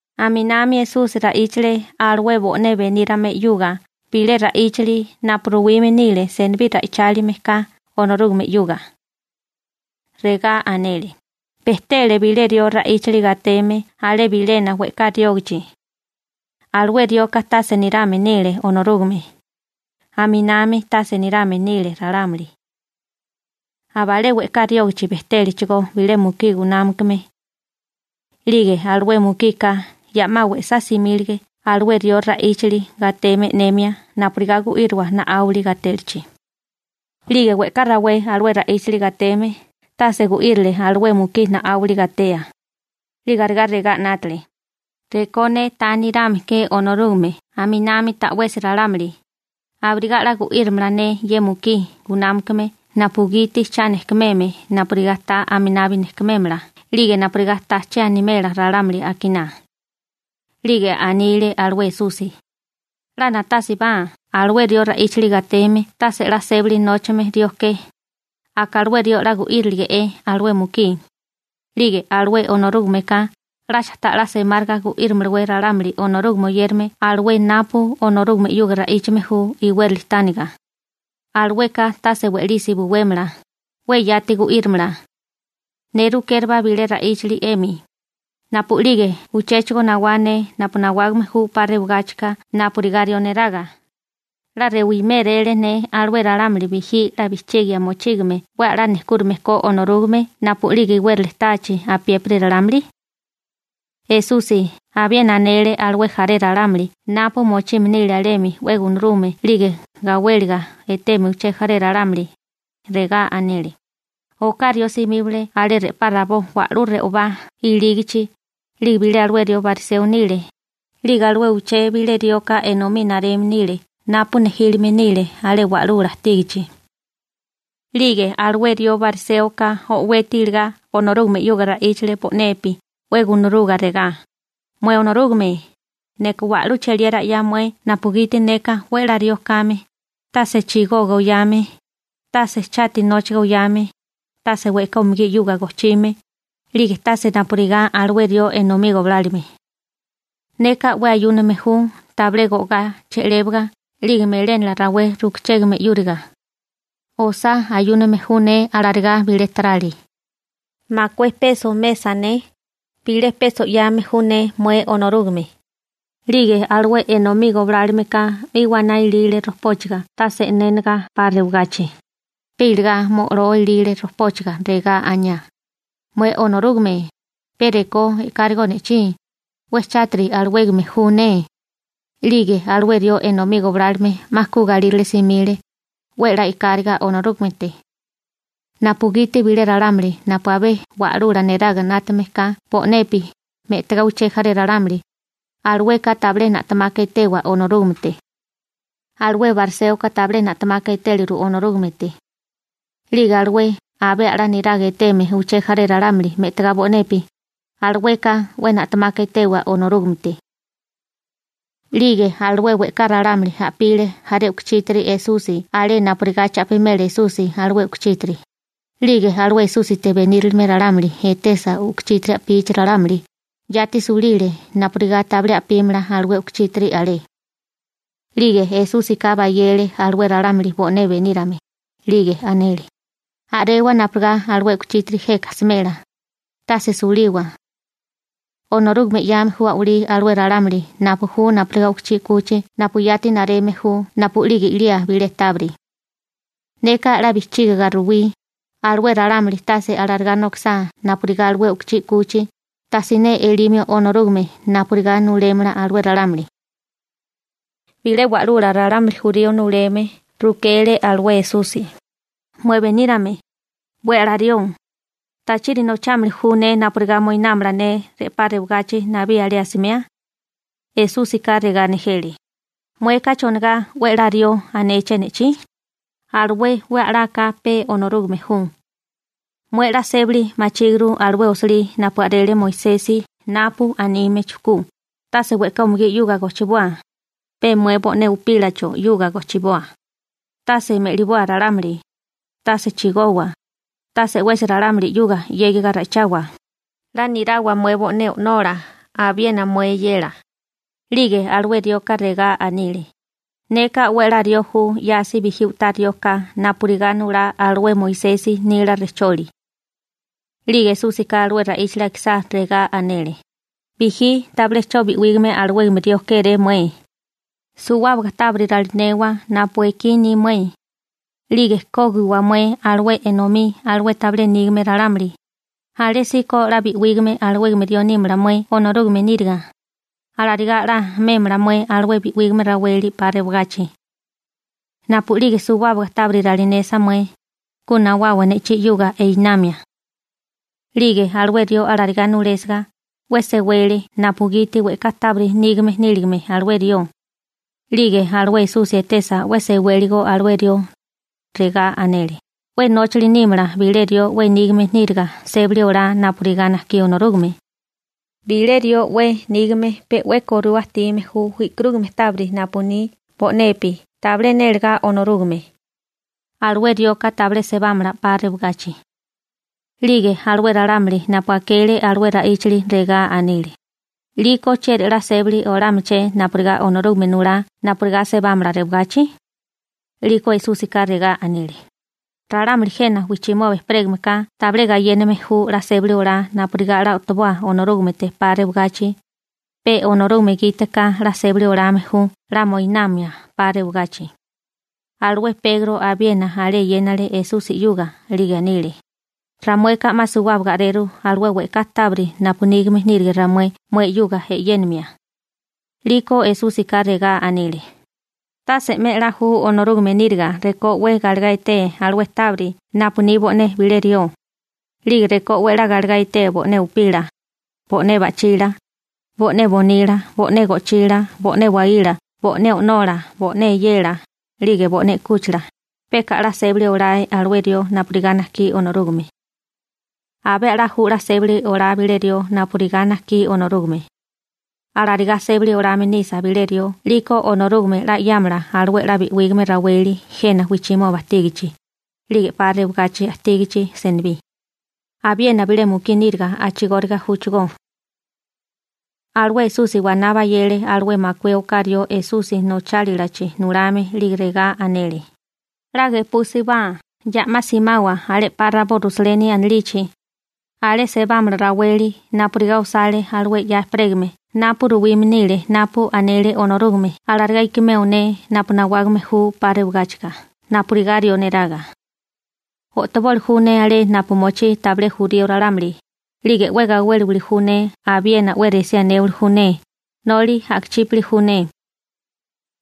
Aminami Esusi ra'íchale alué bo'né benírame 'yuga bilé ra'íchali napu ruwime nile senibí ra'ichálime ka Onorúgame 'yuga. Regá anele: ―Bejtele bilé rió ra'íchali gateme alé bilena we'ká riógachi. Alué rioka tase nirame nile Onorúgame, aminami tase nirame nile ralámuli. Abalé we'ká riógachi bejtélechigó bilé mukí gunámakame. 'Lige alué mukika ya 'ma we'sá simílige alué rió ra'íchali gateme e'nemia napurigá gu'írowa na'áwili gatélichi. › 'Lige we'ká rawé alué ra'íchali gateme tase gu'írile alué mukí na'áwili gatea. 'Lige arigá regá 'nátale: «Rekó ne ta nirame ke Onorúgame aminami ta'wesi ralámuli, abirigá 'la gu'írimala ne ye mukí gunámakame napugiti cha nejkumeme napurigá ta aminabi nejkumémala 'lige napurigá ta che animela ralámuli akiná.» 'Lige anile alué Esusi: ―'La na'tásibá alué rió ra'íchali gateme tase 'la sébali nóchame rió ke, aka alué rió 'la gu'írilige'é alué mukí, 'lige alué Onorúgameka, ¿'lacha ta'lá semáriga gu'írimalawé ralámuli Onorúgame oyérame alué napu Onorúgame 'yuga ra'íchame ju iwérali tániga? Alueka tase we'lisi buwémala, 'we yati gu'írimala. Ne rukérabá bilé ra'íchali 'emi: Napu'lige uchéchigo nawá ne napu nawágame ju 'pa rewagáchika napurigá rió neraga, ¿'la rewiméréle ne alué ralámuli bijí 'la bijchigia mochígame 'we a'lá nejkúrame ko Onorúgame napu'lige iwérali táachi apiépiri ralámuli? Esusi abiena anele alué jaré ralámuli napu mochime nile alemi 'we gunarume 'lige gawéliga eteme uché jaré ralámuli. Regá anele: ―Oká rió simíbale alé re'pá rabó wa'lú re'obá ilígachi, 'lige bilé alué rió bariseo nile, 'lige alué uché bilé rioka enomí nareme nile napu nejílime nile alé wa'lula ajtígachi. 'Lige alué rió bariséoka o'weti iligá Onorúgame 'yuga ra'íchale bo'nepi 'we gunaruga regá: «Mué Onorúgame, neka wa'lú cheliera 'ya mué napugiti neka 'we a'lá rió kame, tase chigoga oyame, tase chati nóchaga oyame, tase we'ká umugí 'yuga gojchime, 'lige tase napurigá alué rió enomí goblálome. Neka 'we ayúname ju tabilé go'gá che'lébaga 'lige melénala rawé rukachégame 'yúriga. Osá ayúname ju ne alarigá bilé tarali. Makué peso mesa ne, bilé peso 'yame ju ne mué Onorúgame.» › 'Lige alué enomí goblálomeka 'mi waná ilile rojpóchaga tase e'nénaga 'pa rewagachi, pe iligá mo'loa ilile rojpóchaga, regá aniá: «Mué Onorúgame, pe rekó e'kárigó ne'chí, 'we chátiri alawégame ju ne.» 'Lige alué rió enomí goblálome 'ma ku galírale simile, 'we a'lá e'káriga Onorúgamete, napugiti bilé ralámuli napu abé wa'lula neraga 'nátame ka bo'nepi me'tagá uché jaré ralámuli, alueka tabilé na'temaka etewa Onorúgamete. Alué bariséoka tabilé na'temaka etéliru Onorúgamete. 'Lige alué abé a'lá niraga eteme uché jaré ralámuli me'tagá bo'nepi, alueka 'we na'temaka etewa Onorúgamete. 'Lige alué we'ká ralámuli a'pile jaré u'kuchítiri Esusi alé napurigá cha'pimela Esusi alué u'kuchítiri, 'lige alué Esúsite benírilime ralámuli etesa u'kuchítiri a'pichi ralámuli, yati sulile napurigá tabilé a'pímala alué u'kuchítiri alé. 'Lige Esúsika bayele alué ralámuli bo'né benírame, 'lige anele: ―A'rewa napurigá alué u'kuchítiri jeka smela, tase suliwa. Onorúgame 'yame ju a'walí alué ralámuli napu ju napurigá u'kuchí 'kuchi napu yati nareme ju napu'lige i'lía bilé tábiri. Neka 'la bijchígaga ruwí, alué ralámuli tase alarigá nokisá napurigá alué u'kuchí 'kuchi, tasiné elimio Onorúgame napurigá nulémala alué ralámuli. Bilé wa'lula ralámuli jurío nuleme rukele alué Esusi: ―Mué, benírame, 'we a'lá rió, ¿tachiri nochámili ju ne napurigá moinámala ne re'pá rewagachi nabí alé asimea? Esúsika regá nejele: ―Mueka ¿chonigá «'we a'lá rió» anéché ne'chí? Alué 'we a'laka pe Onorúgame ju. Mué 'la sébali machíguru alué osilí napu a'rele Moisesi napu anime chujkú: «Tase we'ká umugí 'yuga gojchiboa, pe mué bo'né upílacho 'yuga gojchiboa, tase me'liboa ralámuli, tase chigowa, tase 'wesi ralámuli 'yuga 'yégiga ra'ichawa, 'la nirawa mué bo'né o'nola abiena mué eyela.» 'Lige alué rioka regá anile: ―Neka 'we a'lá rió ju 'yasi bijí u'tá rió ka napurigá nulá alué Moisesi nila rejcholi. 'Lige Esúsika alué ra'íchali akisá, regá anele: ―Bijí tabilé 'cho bi'wígame alawégame rió kéré mué: Suwábaga tábiri ralinewa napu ekí ni mué, 'lige kógiwa mué alué enomí alué tabilé nígame ralámuli, alésíko 'la bi'wígame alawégame rió nímala mué Onorúgame níriga. Alarigá 'la mémala mué alué bi'wígame raweli 'pa rewagachi. Napu'lige suwábaga tábiri ralinesa mué, ku nawawa ne'chí 'yuga einamia. 'Lige alué rió alarigá nulésiga, 'we sewele napugiti we'ká tábiri nígame níligame alué rió. 'Lige alué Esusi etesa 'we sewéligo alué rió, regá anele: ―'We nóchali nímala bilé rió 'we nígame níriga sébali olá napurigá najkí Onorúgame. Bilé rió 'we nígame pe 'we korua ajtime ju e'karúgame tábiri napu ni bo'nepi tabilé nélagá Onorúgame, alué rioka tabilé sebámala 'pa rewagachi. 'Lige alué ralámuli napu akele alué ra'íchali, regá anile: ―'Liko ¿chieri la sébali olámalaché napurigá Onorúgame nulá napurigá sebámala rewagachi? 'Liko Esúsika regá anile: ―Ralámuli jena wijchimoba ejperégameka tabilé gayéname ju 'la sébali olá napurigá 'la o'toboa Onorúgamete 'pa rewagachi, pe Onorúgame gite ka 'la sébali olame ju 'la moinamia 'pa rewagachi. Alué Pegro abiena alé eyénale Esusi 'yuga, 'lige anile: ―Ramueka 'ma suwábaga a'reru alué we'ká tábiri napu nígame nírige ramué mué 'yuga e'yénimia. 'Liko Esúsika regá anile: ―Tase 'me a'lá ju Onorúgame níriga rekó 'we galegá etee alué tábiri napu ni bo'né bilé rió, 'lige rekó 'we a'lá galegá etee bo'né upila, bo'né ba'chila, bo'né bonila, bo'né go'chila, bo'né waíla, bo'né o'nola, bo'né eyela, 'lige bo'né 'kúchila, peka a'lá sébali olae alué rió napurigá najkí Onorúgame. Abé a'lá ju 'la sébali olá bilé rió napurigá najkí Onorúgame. Alarigá sébali olame nisa bilé rió 'liko Onorúgame 'la 'yámala alué 'la bi'wígame raweli jena wijchimoba ajtígachi, 'lige 'pa rewagachi ajtígachi senibí. Abiena bilé mukí níriga a'chigóriga júchigó. Alué Esusi waná bayele alué makué oká rió Esusi nochálalachi nulame 'lige regá anele: ―'La gepúsibá, ya'má simawa alé 'pa rabó Rusaleni anilichi. Alé sebámala raweli napurigá osale alué 'ya ejperégame napu ruwime nile napu anele Onorúgame alarigá ikimeo ne napu nawágame ju 'pa rewagáchika napurigá rió neraga. O'toboli ju ne alé napu mochí tabilé jurío ralámuli, 'lige 'we gawéliwili ju ne abiena 'we resí anéwali ju ne, noli a'kachípali ju ne.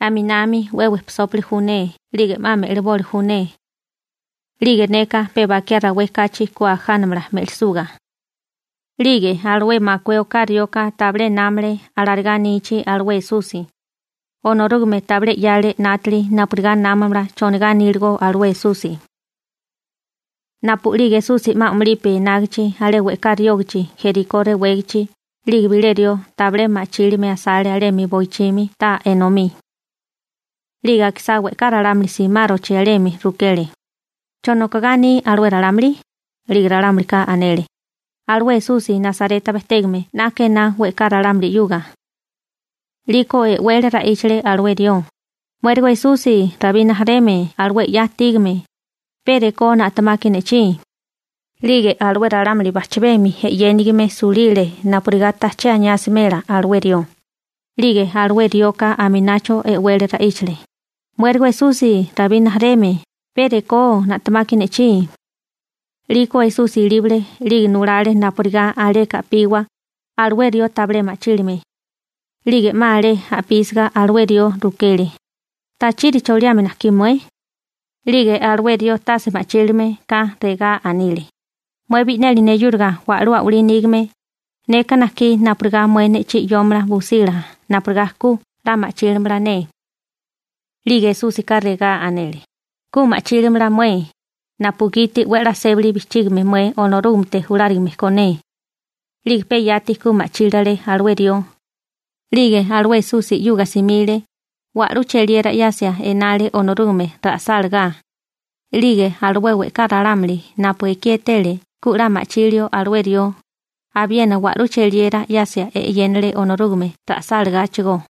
Aminami 'we wejpisópili ju ne 'lige 'ma me'liboli ju ne. 'Lige neka pe bakiá rawé kachi ku ajánamala me'lisuga. 'Lige alué makué oká rioka tabilé námale alarigá anichi alué Esusi. Onorúgame tabilé 'yale 'nátali napurigá námamala chonigá aníligo alué Esusi. Napu'lige Esusi 'ma a'mulipi enágichi alé we'ká riógachi Jerikó rewégachi, 'lige bilé rió tabilé ma'chílime asale alemi boichimi taa enomí. 'Lige akisá we'ká ralámuli simárochi alemi, rukele: ―¿Cho nokogá aní alué ralámuli? 'Lige ralámulika anele: ―Alué Esusi Nasareta bejtégame 'naka ená we'ká ralámuli 'yuga. 'Liko e'wele ra'íchale alué rió: ―¡Muérigo Esusi, Rabí rijimala alué 'ya ajtígame, pe rekó na'temaki ne'chí! 'Lige alué ralámuli bajchabemi e'yénigime sulile napurigá tajché aniá asimela alué rió, 'lige alué rioka aminacho e'wele ra'íchale: ―¡Muérigo Esusi, Rabí rijimala, pe rekó na'temaki ne'chí! 'Liko Esusi ilíbale 'lige nulale napurigá aleka a'piwa alué rió tabilé ma'chílime. 'Lige 'ma alé a'písiga alué rió, rukele: ―¿Tachiri choliame najkí mué? 'Lige alué rió tase ma'chílime ka regá anile: ―Mué bi'neli neyúriga wa'lú a'walí nígame, neka najkí napurigá mué ne'chí 'yómala busila napurigá ku 'la ma'chílamala ne. 'Lige Esúsika regá anele: ―Ku ma'chílimala mué, napugiti 'we a'lá sébali bijchígame mué Onorúgamete julárigame ko ne. 'Lige pe yati ku ma'chílale alué rió, 'lige alué Esusi 'yuga simile, wa'lú cheliera 'yasia enale Onorúgame ra'sálagá. 'Lige alué we'ká ralámuli napu ekí etele ku 'la ma'chilio alué rió, abiena wa'lú cheliera 'yasia e'yénale Onorúgame ra'sálagáchigó.